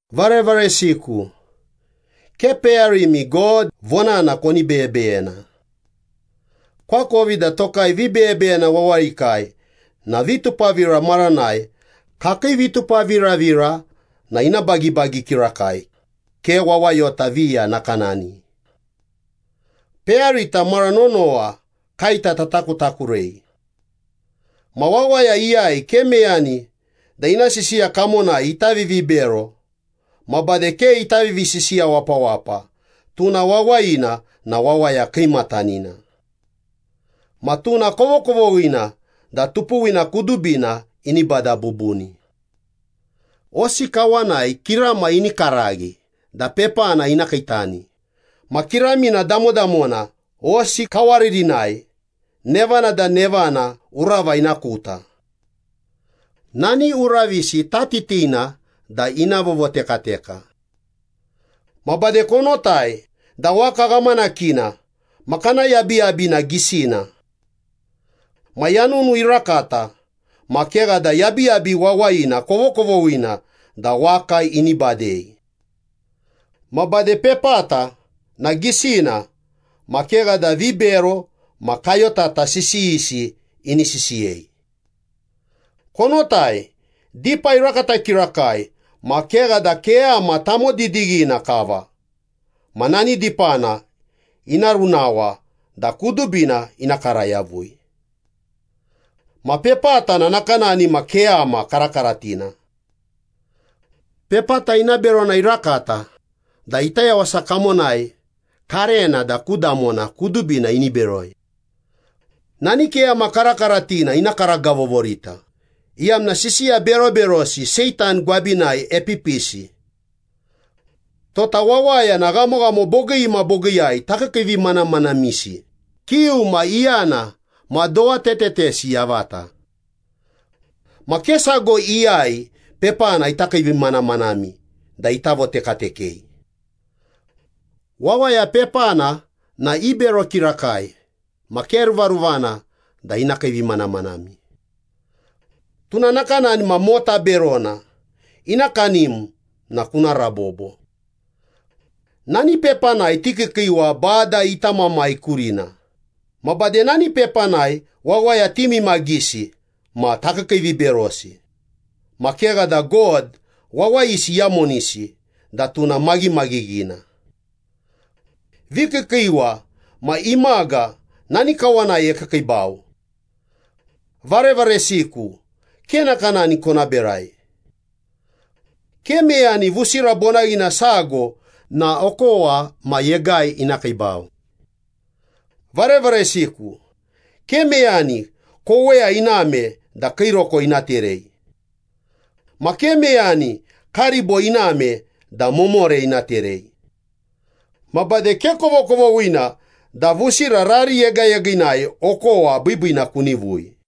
Varevaresiku, ke peyarimi God vonana koni beyebeyena. Koakovi da tokai vibeyebeyena wawayikai na vitupavira maranai kakii vitupaviravira na ina bagibagi kirakai, ke wawayota viya nakanani. Peyarita mara nonowa kaeta tatakutakurei. Ma wawaya iyai ke meyani da ina sisiya kamonai ita vivibero ma bade ke ita vivisisiya wapawapa, tuna wawayina na wawaya kiimatanina. Ma tuna kovokovoghina da tupuwina kudubina ini bada bubuni. Hosi kawanai kirama ini karaghi da pepana ina kiitani, ma kiramina damodamona hosi kawaririnai, nevana da nevana urava ina kuta. Nani uravisi tatitina da ina vovotekateketa. Ma bade konotai da waka ghamanakina ma kana yabiyabi na gisina. Ma yanunu irakata, ma kegha da yabiyabi wawayina kovokovoghina da waka ini badei. Ma bade, pepata na gisina ma kegha da vibero ma kayotata sisiyisi ini sisiyei. Konotai, dipa irakata kirakai ma kegha da keyama tamodidighina kava ma nani dipana ina runawa da kudubina ina kara yavui! Ma pepata na nakanani ma keyama karakaratina. Pepata ina berona irakata da ita yawasa kamonai karena da ku damona kudubina ini beroi. Nani keyama karakaratina ina karagavovorita, iyamna sisiya beroberosi Seitan gwabinai epipisi. Tota wawaya na ghamoghamo bogii ma bogiiyai takiikiivimanamanamisi, kiu ma iyana ma dowa tetetesi yavata. Ma ke sago iyai pepana ita kiivimanamanami da ita votekatekei. Wawaya pepana na ibero kirakai ma ke ruvaruvana da ina kiivimanamanami. Tuna nakanani ma mota berona, ina kanim na kuna rabobo. Nani pepanai tikiikiiwa Bada ita Mamai kurina ma bade nani pepanai wawaya timimagisi ma takiikiiviberosi, ma kegha da God wawayisi iyamonisi da tuna maghimaghighina. Vikiikiiwa ma imaga nani kawanai ekiikiibau. Varevaresiku, ke nakanani kona berai. Ke meyani vusira bonaghina sago na okowa ma yegai ina kiibau. Varevaresiku, ke meyani koweya iname da kiiroko ina terei. Ma ke meyani karibo iname da momore ina terei. Ma bade ke kovokovoghina da vusira rari yegayegiinai okowa biibiina kunivui.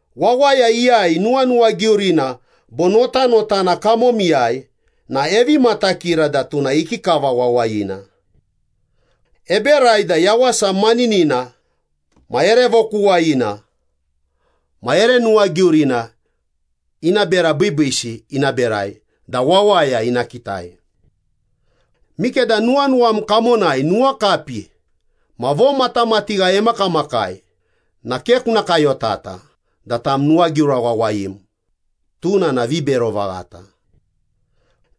Wawaya iyai nuwanuwagiurina bo notanotana kamomiyai na evi matakira da tuna ikikava wawayina. Eberai da yawasa maninina ma ere vokuwayina ma ere nuwagiurina ina bera biibiisi ina berai da wawaya ina kitai. Mikeda nuwanuwam kamonai nuwakapi ma vomatamatigha emakamakai na ke kuna kayotata da tam nuwagiura wawayim, tuna na vibero vaghata.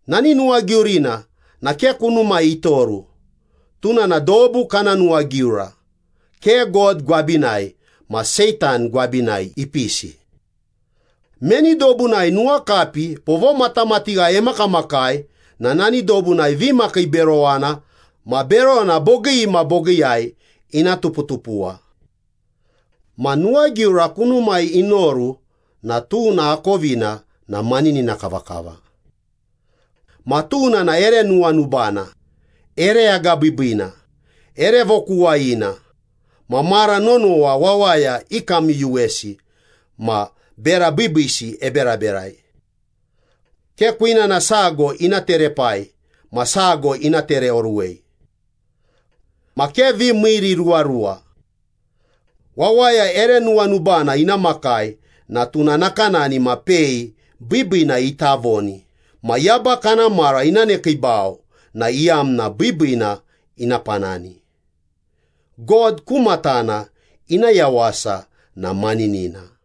Nani nuwagiurina na ke kunumai itoru, tuna na dobu kana nuwagiura, ke God gwabinai ma Seitan gwabinai ipisi. Meni dobunai nuwakapi bo vomatamatigha emakamakai na nani dobunai vimakiiberowana ma berona bogii ma bogiiyai ina tuputupuwa. Ma nuwagiura kunumai inoru na tuna akovina na maninina kavakava. Ma tuna na ere nuwanubana, ere agabiibiina, ere vokuwayina, ma mara nonowa wawaya ikamyuyuwesi ma bera biibiisi eberaberai. Ke kwinana sago ina terepai ma sago ina tereoruwei. Ma ke vimiiriruwaruwa. Wawaya ere nuwanubana ina makai na tuna nakanani ma pei biibiina ita voni ma yaba kana mara ina nekiibau na iyamna biibiina ina panani, God ku matana ina yawasa na maninina.